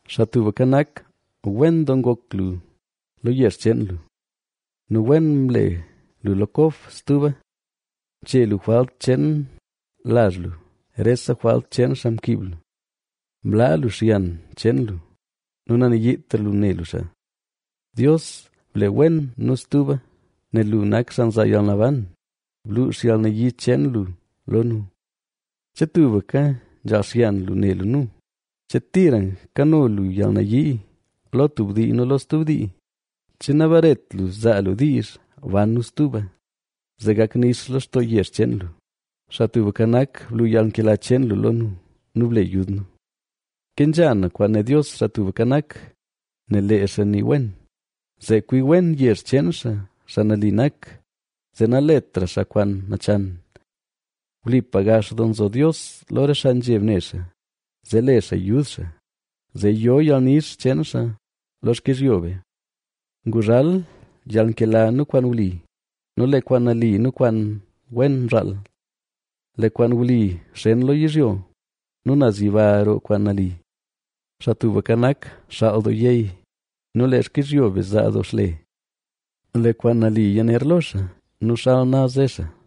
Xaa Tubka Nak, wen doo ngok lu lo yezh cheen lu nu wen mle lu Kob stuba. Mche lu jwalt cheen lazh lu, rese jwalt cheen xaa mkiib lu. Mlaa lu xyan cheen lu nu nanayiitra lu ne lu xaa. Dios, ble wen nu stuba, nel lu nak xaa nzaa yalnaban; bluux yalnayii cheen lu lo nu. ¿Che tubka nzhaal xyan lu ne lu nu? ¿Che tira kano lu yalnayii lo tub dii nu lo stub dii? ¿Che nabaret lu zaa lu diizh ban nu stuba, zee gak nix lextoo yezh cheen lu? Xaa Tubka Nak, blu yalnkela cheen lu lo nu nu ble yud nu. Kenzha na kwaan né Dios, Xaa Tubka Nak, nel lee xaa nii wen, zee kwi wen yezh cheen xaa, xaa nali nak, zee naletra xaa kwaan nachan. Wlipa gax doo nzo Dios lo re xaa nzheb ne xaa, zee le xaa yud xaa, zee yo yalnix cheen xaa lo xkizhyo be. Nguzhal yalnkela nu kwaan wli nu lee kwaan nali nu kwaan wen mzhaal. Lee kwaan wli xen lo yizhyo, nu naz yiba roo kwaan nali. Xaa Tubka Nak, xaal doo yey, nu lee xkizhyo be zaa doo xle. Lee kwaan nali yaner lo xaa nu xal naz ze xaa.